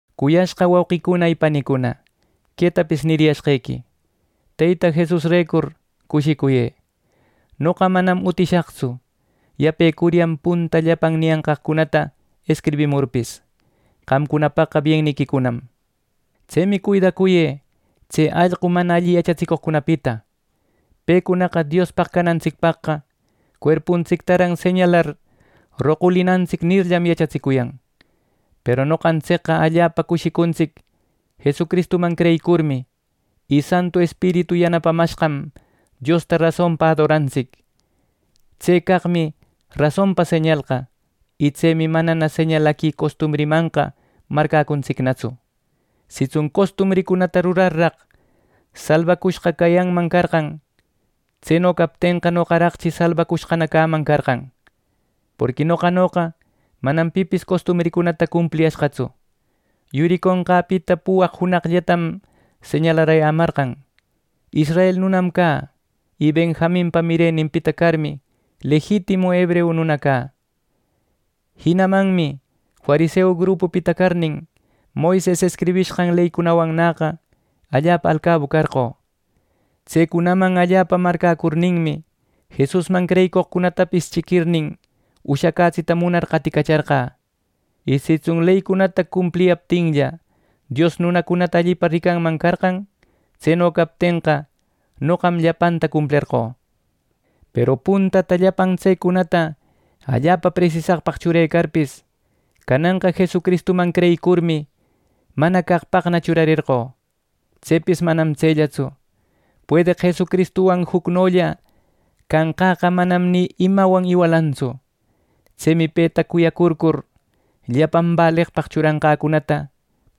Cuyashqa wauqicuna y panicuna, quetapis niriyashqequi: Teyta Jesusrecur cushicuyë. Noqa manam utishaqtsu, yapecuryan punta llapan niyanqaqcunata escribimurpis. Qamcunapaqqa bienniquicunam. Tsemi cuidacuyë tse allqu mana alli yachatsicoqcunapita. Pecunaqa “Diospaq canantsicpaqqa cuerpuntsictaran señalar roqulinantsic” nirllam, yachatsicuyan. Peru noqantsicqa allapa cushicuntsic Jesucristuman creyicurmi, y Santu Espiritu yanapamashqam Diosta rasonpa adorantsic. Tse caqmi rasonpa señalqa, y tsemi manana señalaqui costumbrimanqa marcäcuntsicnatsu. Sitsun costumbricunata rurarraq, salbacushqa cayanman carqan; tseno captenqa, noqaraqchi salbacushqana cäman carqan. Porqui noqanoqa manam pipis costumbricunata cumpliyashqatsu. Yuriconqäpita puwaq junaqllatam señalarayämarqan. Israel nunam cä; y Benjaminpa mireninpita carmi, lejitimu hebreu nuna cä. Jinamanmi fariseu grupupita carnin, Moises escribishqan leycunawannäqa allapa alcabu carqö. Tsecunaman allapa marcäcurninmi, Jesusman creyicoqcunatapis chiquirnin ushacätsita munar qaticacharqä. Y sitsun leycunata cumpliyaptinlla, Dios nunacunata allipa ricanman carqan; tseno captenqa, noqam llapanta cumplerqö. Peru puntata llapan tsecunata allapa presisaqpaq churecarpis, cananqa Jesucristuman creyicurmi mana caqpaqna churarerqö. Tsepis manam tsellatsu; puedeq Jesucristuwan jucnolla canqäqa manam ni imawan iwalantsu. Tsemi peta cuyacurcur, llapan baleqpaq churanqäcunata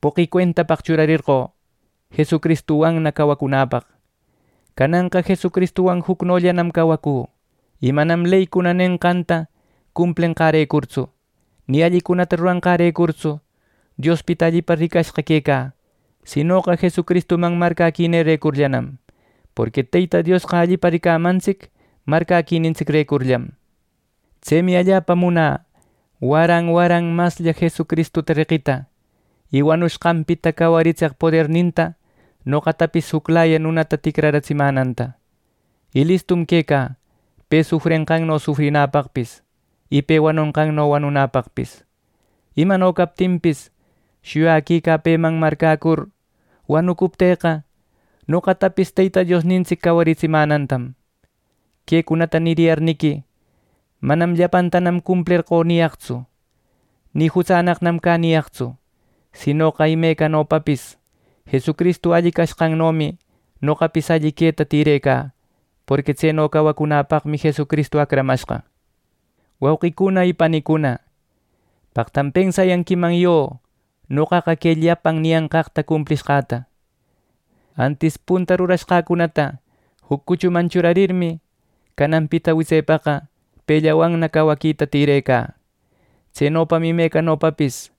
poqi cuentapaq churarerqö Jesucristuwanna cawacunäpaq. Cananqa Jesucristuwan jucnollam cawacü y manam leycuna nenqanta cumplenqärecurtsu, ni allicunata ruranqärecurtsu Diospita allipa ricashqa quecä, sinoqa Jesucristuman marcäquinirecurllanam; porqui Teyta Diosqa allipa ricamantsic marcäquinintsicrecurllam. Tsemi allapa munä waran waran maslla Jesucristuta reqita, y wanushqanpita cawaritseq poderninta noqatapis juclaya nunata ticratsimänanta. Y listum quecä, pe sufrenqanno, sufrinäpaqpis, y pe wanonqanno wanunäpaqpis. Imano captinpis, shuyaquicä peman marcäcur wanucuptïqa, noqatapis Teyta Diosnintsic cawaritsimänantam. Quecunata niyarniqui manam “llapantanam cumplerqö” niyaqtsu, ni “jutsannaqnam cä” niyaqtsu; sinoqa imecanopapis Jesucristu alli cashqannomi noqapis alli queta tïrecä, porqui tseno cawacunapaqmi Jesucristu acramashqa. Wauqicuna y panicuna, paqtam pensayanquiman yo noqaqa que llapan niyanqaqta cumplicashqäta, antis punta rurashqäcunata juc cuchuman churarirmi, cananpita witsepaqa pellawanna caweta tirecä. Tsenopam imecanopapis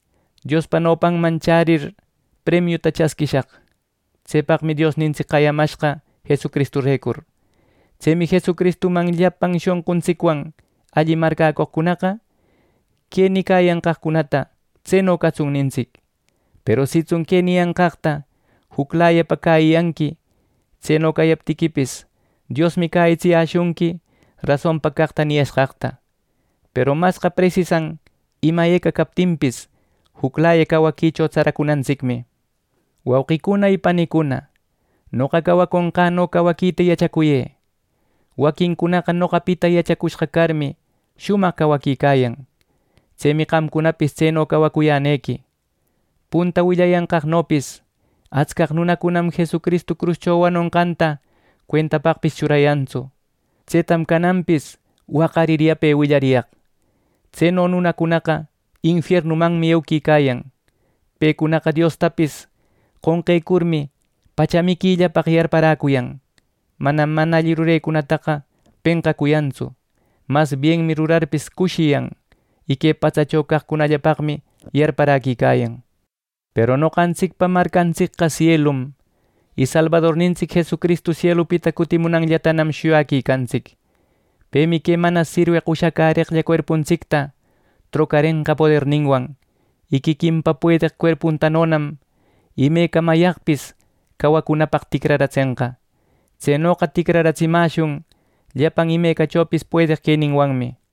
Diospa nopanman chärir, premiuta chasquishaq. Tsepaqmi Diosnintsic qayamashqa Jesucristurecur. Tsemi Jesucristuman llapan shonquntsicwan alli marcäcoqcunaqa, que nicayanqaqcunata “¡Tseno catsun!” nintsic. Peru sitsun que niyanqaqta juclayapa cäyiyanqui, tseno cayaptiquipis, Diosmi cäyitsiyäshunqui rasonpa caqta niyashqaqta. Peru masqa presisan ima eca captinpis juclaya cawaquicho tsaracunantsicmi. Wauqicuna y panicuna, noqa cawaconqäno cawaquita yachacuyë. Waquincunaqa noqapita yachacushqa carmi, shumaq cawaquicayan. Tsemi qamcunapis tseno cawacuyänequi. Punta willayanqaqnopis atscaq nunacunam Jesucristu cruscho wanushqanta cuentapaqpis churayantsu. Tsetam cananpis waqarir yape willariyaq. Tseno nunacunaqa infiernumanmi euquicayan. Pecunaqa Diostapis qonqecurmi, pacha miquillapaq yarparäcuyan. Manam mana alli rurenincunata penqacuyantsu, mas bienmi rurarpis cushiyan. Y que patsacho caqcunallapaqmi yarparäquicayan. Peru noqantsicpa marcantsicqa sielum, y Salbadornintsic Jesucristu sielupita cutimunanllatanam shuyaquicantsic. Pemi que mana sirweq ushacäreqlla cuerpuntsicta trocarenqa poderninwan, y quiquinpa puedeq cuerpuntanonam imecamayaqpis cawacunapaq ticraratsenqa. Tsenoqa ticraratsimäshun llapan imecachopis puedeq queninwanmi.